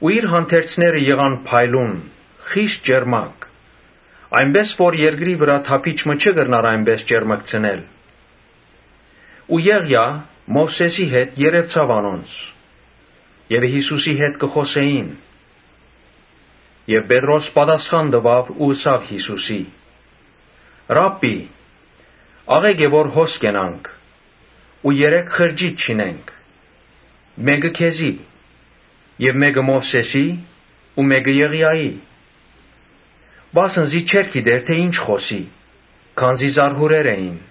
Իր հանդերձները եղան փայլուն, խիստ ճերմակ, այնպէս որ երկրի վրայ թափիչ մը չէր կրնար այդպէս ճերմկցնել։ Ու Եղիան Մովսէսին հետ երեւցաւ անոնց եւ Յիսուսին հետ խօսեցան։ Ապա Պետրոս ըսաւ Յիսուսին. «Ռա՛բբի, աղէկ է որ հոս կենանք ու երեք խրճիթ շինենք, մէկը՝ քեզի, մէկը՝ Մովսէսին ու մէկը՝ Եղիային»։ Վասն զի չէր գիտեր թէ ի՛նչ խօսի, քանզի զարհուրեր էին։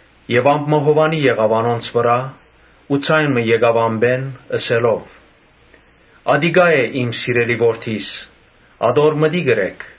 Ամպ մը հովանի եղաւ անոնց վրայ ու ձայն մը եկաւ ամպէն՝ ըսելով. «Ատիկա է իմ սիրելի Որդիս, ատոր մտիկ ըրէք»։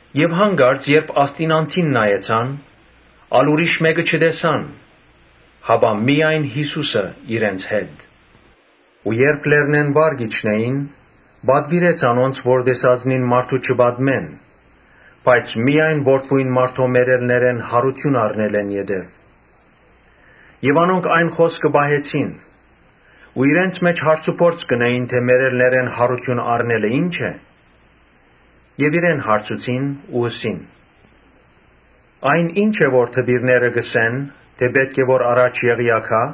Երբ յանկարծ ասդին անդին նայեցան, ուրիշ մէկը չտեսան, հապա միայն Յիսուսը՝ իրենց հետ։ Երբ լեռնէն վար կ’իջնէին, պատուիրեց անոնց որ տեսածնին մարդու չպատմեն, բայց միայն Որդին մարդոյ մեռելներէն յարութիւն առնելէն յետոյ։ Անոնք այն խօսքը պահեցին ու իրենց մէջ հարցուփորձ կ’ընէին թէ ‘Մեռելներէն յարութիւն առնել ի՞նչ ըսել է’։ Իրեն հարցուցին ու ըսին. «Այն ի՞նչ է որ դպիրները կ’ըսեն թէ ‘Պէտք է որ առաջ Եղիան գայ’»։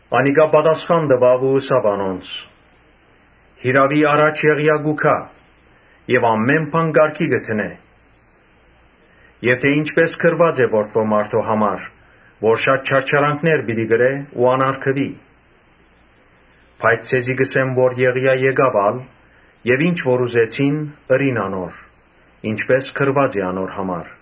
Անիկա պատասխան տուաւ ու ըսաւ անոնց. «Յիրաւի առաջ Եղիան պիտի գայ եւ ամէն բան կարգի դնէ, ի՛նչպէս գրուած է Որդին մարդոյ համար, որ շատ չարչարանքներ պիտի կրէ ու անարգուի. Բայց ձեզի կ’ըսեմ թէ Եղիան եկաւ ալ եւ ինչ որ ուզեցին՝ ըրին անոր, ինչպէս գրուած էր անոր համար»։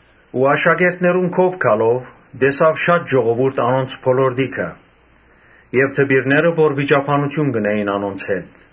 Աշակերտներուն քովը գալով՝ տեսաւ շատ ժողովուրդ անոնց բոլորտիքը եւ դպիրներ, որ վիճաբանութիւն կ’ընէին անոնց հետ։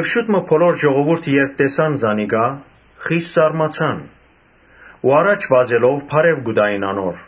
Բոլոր ժողովուրդը, երբ տեսան զանիկա, խիստ զարմացան ու առաջ վազելով բարեւ կու տային անոր։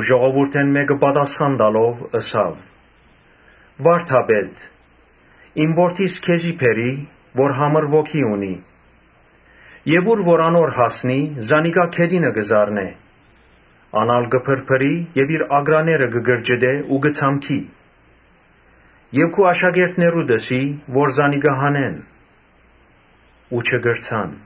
Ժողովուրդէն մէկը պատասխան տալով՝ ըսաւ. «Վա՛րդապետ, իմ որդիս քեզի բերի, որ համր ոգի ունի։ Ուր որ անոր հասնի, զանիկա գետինը կը զարնէ, ան ալ կը փրփրի եւ իր ակռաները կը կրճտէ ու կը ցամքի։ Քու աշակերտներուդ բերի որ զանիկա հանեն ու չկրցան»։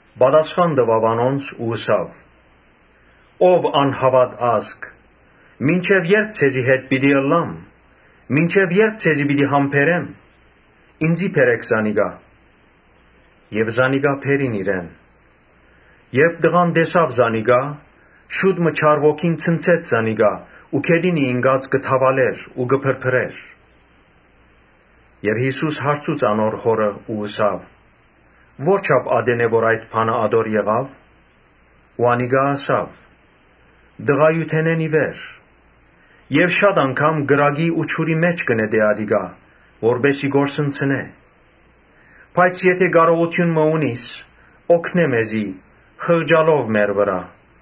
Պատասխան տուաւ անոնց ու ըսաւ. «Ով անհաւատ ազգ, մինչեւ ե՞րբ ձեզի հետ պիտի ըլլամ, մինչեւ ե՞րբ ձեզի պիտի համբերեմ. ինծի բերէք զանիկա»։ Զանիկա բերին իրեն. երբ տղան տեսաւ Յիսուսը, շուտ մը չար ոգին ցնցեց զանիկա որը գետին ինկաւ, թաւալեցաւ ու փրփրեցաւ։ Յիսուս հարցուց անոր հօրը ու ըսաւ. «Ո՞րչափ ատեն է որ այդ բանը ատոր եղաւ»։ Անիկա ըսաւ. «Տղայութենէն ի վեր։ Շատ անգամ կրակի ու ջուրի մէջ կը նետէ ատիկա՝ որպէս զի կորսնցնէ. բայց եթէ կարողութիւն մը ունիս՝ օգնէ մեզի, խղճալով մեր վրայ»։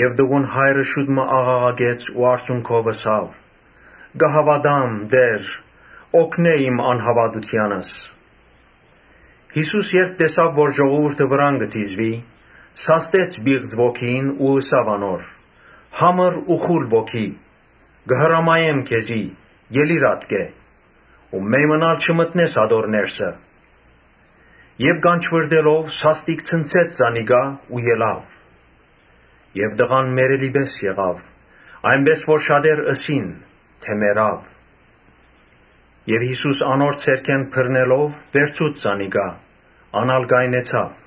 Տղուն հայրը աղաղակեց ու արցունքով ըսաւ. «Կը հաւատամ, Տէ՛ր, օգնէ իմ անհաւատութեանս»։ Յիսուս, երբ տեսաւ որ ժողովուրդը վրան կը դիզուի, սաստեց պիղծ ոգիին ու ըսաւ անոր. «Համր ու խուլ ոգի, կը հրամայեմ քեզի, ելի՛ր ատկէ, ու մեյմըն ալ չմտնես ատոր ներսը»։ Ոգին կանչուըռտելով՝ սաստիկ ցնցեց զանիկա ու ելաւ. եւ տղան մեռելի պէս եղաւ, այնպէս որ շատեր ըսին թէ «Մեռաւ»։ Իսկ Յիսուս անոր ձեռքէն բռնելով վերցուց զանիկա։ Ան ալ կայնեցաւ։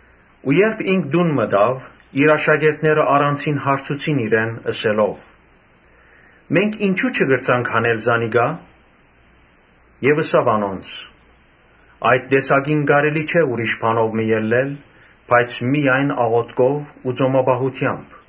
Ու երբ ինք տուն մտաւ, իր աշակերտները առանձինն հարցուցին իրեն՝ ըսելով. «Մենք ինչո՞ւ չկրցանք հանել զանիկա»։ Ըսաւ անոնց. «Այդ տեսակը կարելի չէ ուրիշ բանով մը հանել, բայց միայն աղօթքով ու ծոմապահութեամբ»։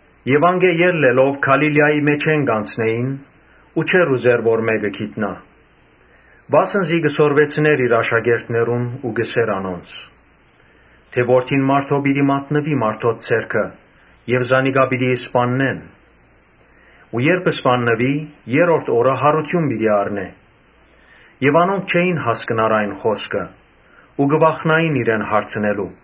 Անկէ ելլելով Գալիլիայի մէջէն կ’անցնէին ու չէր ուզեր որ մէկը գիտնայ։ Վասն զի կը սորվեցնէր իր աշակերտներուն ու կ’ըսէր անոնց թէ՝ Որդին մարդոյ պիտի մատնուի մարդոց ձեռքը, զանիկա պիտի սպաննեն ու երբ սպաննուի՝ երրորդ օրը յարութիւն պիտի առնէ։ Անոնք չէին հասկնար այն խօսքին իմաստը ու կը վախնային իրեն հարցնելու։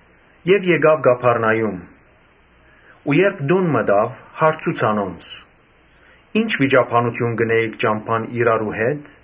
Եկաւ Կափառնայում ու երբ տուն մտաւ՝ հարցուց անոնց. «Ի՞նչ վիճաբանութիւն կ’ընէիք ճամբան իրարու հետ»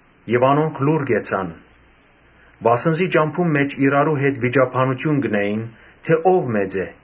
Անոնք լուռ կեցան, վասն զի ճամբուն մէջ իրարու հետ վիճաբանութիւն կ’ընէին թէ՝ ո՞վ մեծ է։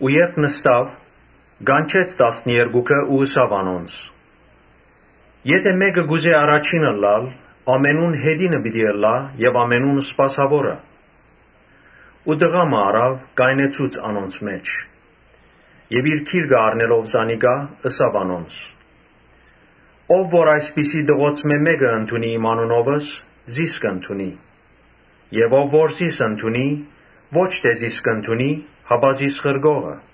Երբ նստաւ, կանչեց տասներկուքը ու ըսաւ անոնց. «Եթէ մէկը կ’ուզէ առաջին ըլլալ, ամենէն յետինը պէտք է ըլլայ եւ ամենուն սպասաւորը»։ Ու տղայ մը առաւ կայնեցուց անոնց մէջ. ապա իր գիրկը առնելով զանիկա՝ ըսաւ անոնց. «Ով որ այսպիսի տղոցմէ մէկը ընդունի իմ անունովս, զիս կ’ընդունի եւ ով որ զիս ընդունի, ոչ թէ զիս կ’ընդունի, հապա զիս ղրկողը»։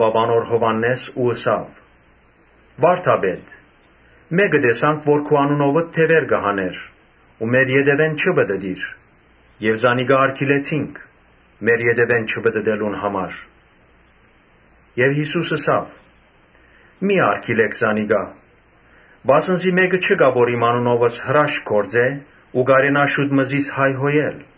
Յովհաննէս Յիսուսին ըսաւ. «Վա՛րդապետ, մէկը տեսանք որ քու անունովդ դեւեր կը հանէր, բայց մեր ետեւէն չի պտըտիր։ Զանիկա արգիլեցինք՝ մեր ետեւէն չպտըտելուն համար։ Յիսուս ըսաւ. «Մի՛ արգիլէք զանիկա, վասն զի մէկը չկայ, որ իմ անունովս հրաշք գործէ ու կարենայ ինծի հայհոյել։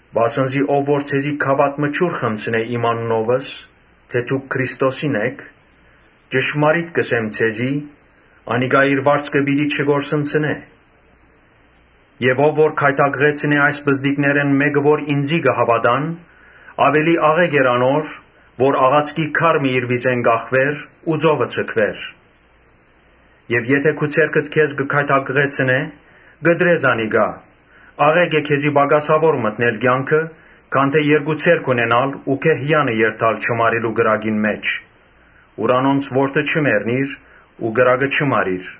Վասն զի ան որ ձեզի գաւաթ մը ջուր խմցնէ Ոմանք, այս անունովիմ անունովս՝ ՝ թէ դուք Քրիստոսինն էք, ճշմարիտ կ’ըսեմ ձեզի, ‘Անիկա իր վարձքը պիտի չկորսնցնէ’»։ «Եւ ով որ գայթակղեցնէ այս պզտիկներէն մէկը, որ ինծի կը հաւատայ, աւելի աղէկ էր որ ջաղացքի քար մը անոր վզէն կախուէր ու ծովը ձգուէր»։ «Եթէ քու ձեռքդ քեզ կը գայթակղեցնէ, կտրէ զանիկա. աղէկ է քեզի պակասաւոր մտնել կեանքը, քան թէ երկու ձեռք ունենալ ու գեհեանը երթալ չմարելու կրակին մէջ, Ուր անոնց որդը չի մեռնիր ու կրակը չի մարիր։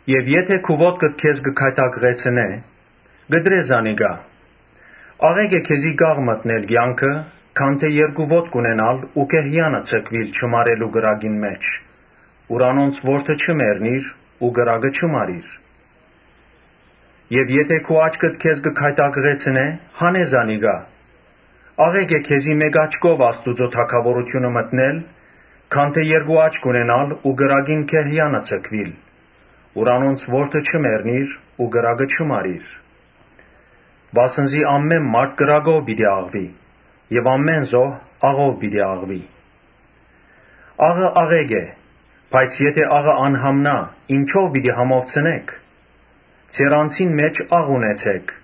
Եթէ քու ոտքդ քեզ կը գայթակղեցնէ, կտրէ զանիկա. աղէկ է քեզի կաղ մտնել կեանքը, քան թէ երկու ոտք ունենալ ու գեհեանը ձգուիլ չմարելու կրակին մէջ, Ուր անոնց որդը չի մեռնիր ու կրակը չի մարիր։ Եթէ քու աչքդ քեզ կը գայթակղեցնէ, հանէ զանիկա. աղէկ է քեզի մէկ աչքով Աստուծոյ թագաւորութիւնը մտնել, քան թէ երկու աչք ունենալ ու կրակին գեհեանը ձգուիլ, Ուր անոնց որդը չի մեռնիր ու կրակը չի մարիր։ Վասն զի ամէն մարդ կրակով պիտի աղուի եւ ամէն զոհ աղով պիտի աղուի։ Աղը աղէկ է, բայց եթէ աղը անհամնայ, ինչո՞վ պիտի համովցնէք. ձեր անձին մէջ աղ ունեցէք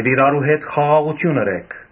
եւ իրարու հետ խաղաղութիւն ունեցէք»։